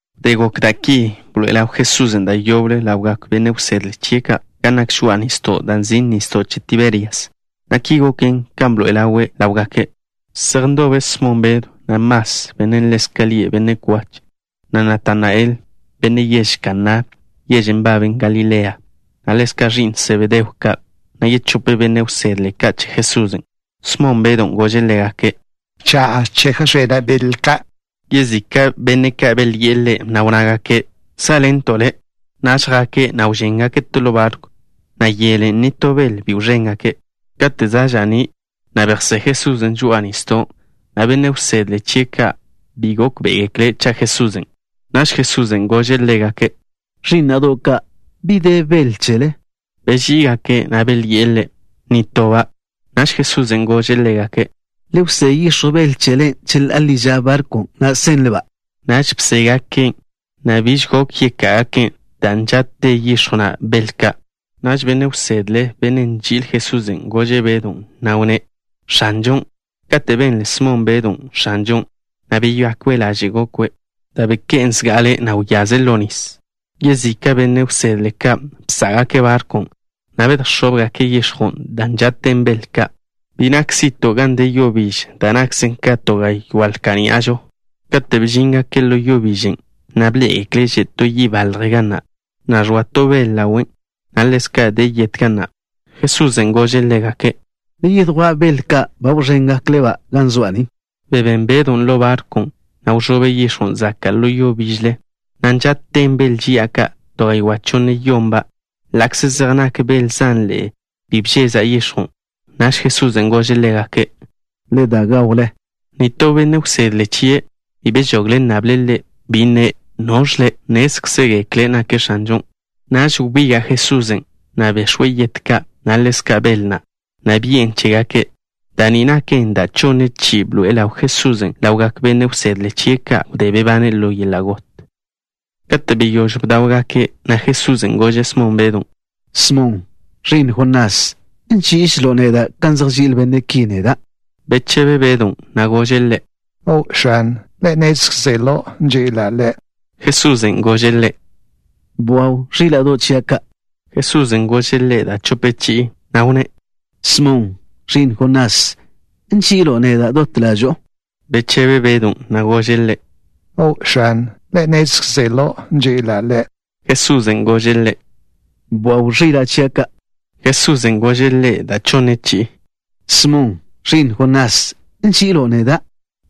Wdé gok da' ki, bḻoe'e ḻaw Jesusen' da' yoble ḻawgak benne' wsedle chie' ka' gan nak žoa'a nisdo' da' nzin' Nisdo' Che Tiberias, na' ki goken kan bḻoe'e ḻawe' ḻáwgake'. Zej ndobe Smon Bedw, na' Mas, bennen' ḻezka' lie' Benne' Kwach, na' Natanael, benne' yež Kaná, yežen' nbaben Galilea, na' ḻezka' ẕi'n Sebedeo ka', na' yechope benne' wsedle ka' che Jesusen'. Smon Bedwn' gože' ḻégake': —Cha'a chejx̱ena' bel ka'. Yezika' benne' ka' belyi'e ḻe', na' wnnágake': —Sá'ḻento' le'. Naž jake', na' wžéngake' to ḻo barkw, na' yelen' nitó bel bi wẕéngake'. Kate' za' ža'ní', bejsé Jesusen' žoa'a nisdon', na' benne' wsedle chie' ka' bi gókbe'egekle' cha' Jesusen'. Naž Jesusen' gože' ḻégake': —Ẕí'na'do' ka', ¿bi de bel chele? Beží'igake', na' belyi'e Ḻe': —Nitoba'. Naž Jesusen' gože' ḻégake': —Le wsé yix̱jw bel chele cheḻá'a ḻi ža barkwn', na' senle-ba'. Naž bségaken', na' biž gok yeká'agaken', dan' nža'te yix̱jw na' bel ka'. Naž benne' wsedle, bennen' nži'il Jesusen', gože' Bedon', na' wnné': —¡X̱anžon'! Kate' benle Smon Bedon', “X̱anžon'” beyakwe' laže' gokwe', da' beké'en zga'ale, na' wyaze' ḻo nis. Yezika' benne' wsedle ka' bsá'gake' barkwn', na' bedjẕóbgake' yix̱jwn' dan' nža'ten bel ka'. Bi nak zi'to' gan de yo biž, da' nakze ka to gaywá' lka' ní'ažo. Katen' bžíngake' ḻo yo bižen', na' bḻé'egekle' že' to yi' balje ga na', na' ẕoa to bel ḻawen', na' ḻezka' de yet ga na'. Jesusen' gože' ḻégake': —Le yedjwá' bel ka' ba wẕéngakle-ba' ga zoa' ni. Bebén Bedon' ḻo barkwn', na' wẕobe' yix̱jwn' zaka' ḻo yo bižle, na' nža'ten bel ži'a ka', to gaywá' chonne-yonba'. Ḻa'kze zej nak bel zanḻe'e, bi bžeza' yix̱jwn'. Naž Jesusen' gože' ḻégake': —Le da gawle. Nitó benne' wsedle chie' bi bežogle' nnable' Ḻe', bi nne': “¿Noẕ Le'?” Nnézkzegekle' nake' X̱anžon'. Naž wbiga' Jesusen', na' bex̱we' yet ka', na' ḻezka' bel na', na' bi'en chégake'. Da' ni naken da' chonne chi'i bḻoe'e ḻaw Jesusen' ḻawgak benne' wsedle chie' ka' wdé bebane' ḻo yeḻa' got. Kate' beyóž bdáwgake', Jesusen' gože' Smon Bedw: —Smon, ẕi'n Jonás, ¿nží'iželo' neda' kan zej nži'il benne' ki neda'? Bechebe Bedon', na' gože' Ḻe': —O', X̱an. Le' nnézkzelo' nži'ila' Le'. Jesusen' gože' ḻe': —Bwaw ẕíla'do' chia' ka'. Jesusen' gože' ḻe' da' chope chi'i, na' wnné': —Smon, ẕi'n Jonás, ¿nži'ilo' neda' dot ḻažo'o? Bechebe Bedon', na' gože' Ḻe': —O', X̱an. Le' nnézkzelo' nži'ila' Le'. Jesusen' gože' ḻe': —Bwaw ẕila' chia' ka'. Jesusen' gože' ḻe' da' chonne chi'i: —Smon, ẕi'n Jonás, ¿nži'ilo' neda'?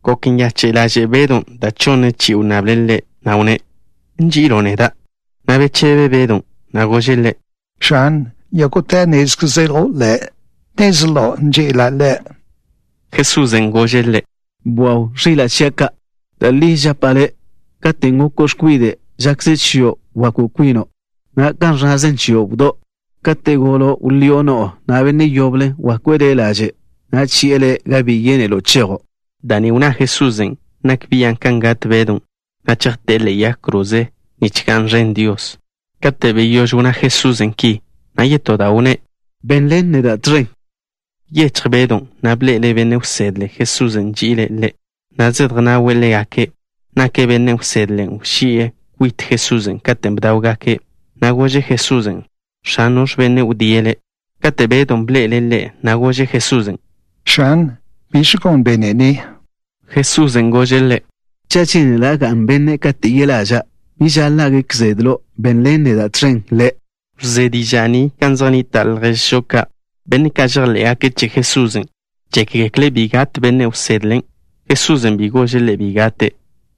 Gok nyache' ḻaže' Bedon' dan' chonn chi'i wnnable' ḻe', na' wnné': “¿Nži'ilo' neda'?” na' bechebe Bedon', na' gože' Ḻe': —X̱an, yógo'te nnézkzelo' Le'. Nnezlo' nži'ila' Le'. Jesusen' gože' ḻe': —Bwaw ẕila' chia' ka'. Da' li žapa' le', katen' goko' x̱kwide', žakze chio' bwakw kwino', na' kan ẕnnazen chio' wdó'. Kate' golo', wḻío' no'o, na' benne' yoble wakwe' le' laže', na' chi'e le' gan bi yénelo' chejo'. Da' ni wnná Jesusen' nak bian' kan gat Bedon', dan' chejté'e ḻe'e yag kroze, nich ga'n ẕen Dios. Kate' beyóž wnná Jesusen' ki, yetó da' wnné': —Benḻen neda' tẕen. Byechj Bedon', na' bḻe'ele' benne' wsedlen' Jesusen' nži'ile' ḻe', zedjnawe' ḻégake'. Nake' benne' wsedlen' wži'e kwit Jesusen' katen' bdáwgake', na' gože' Jesusen': “X̱an, ¿noẕ bennen' wdíe' Le'?” Kate' Bedon' bḻe'ele' ḻe', gože' Jesusen': —X̱an, ¿biẕ gon benne' ni? Jesusen' gože' ḻe': —Cha' žénela' ga'n bennen' kate' yeḻa'ža', bi žaḻa' gek zedlo'. Benḻen neda' tẕen le'. Wzé diža' ni gan zej nnita' lježžo ka', benne' ka' žejḻé'gake' che Jesusen'. Žékgekle' bi gat benne' wsedlen'. Jesusen' bi gože' ḻe' bi gate',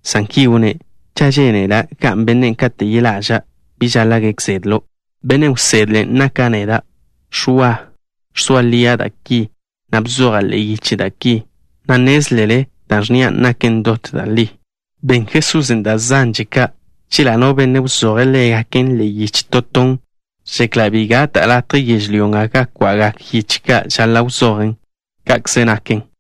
san ki wnné': “Cha' žénela' ga'n bennen' kate' yeḻa'ža', bi žaḻa' gek zedlo'.” Benne' wsedlen' naka' neda', Ẕwa. Ẕzoa lia' da' ki, na' bzoja' ḻe'e yiche da' ki, na' nnézlele da' ẕnnia' naken dot da' li. Ben Jesusen' da' zanže ka'. Chela' no benne' wzoje' ḻégaken ḻe'e yiche to ton, žekla' bi gata' latje yežlyó nga ga kwa'gak yiche ka' žaḻa' wzojen'. Ka'kze naken.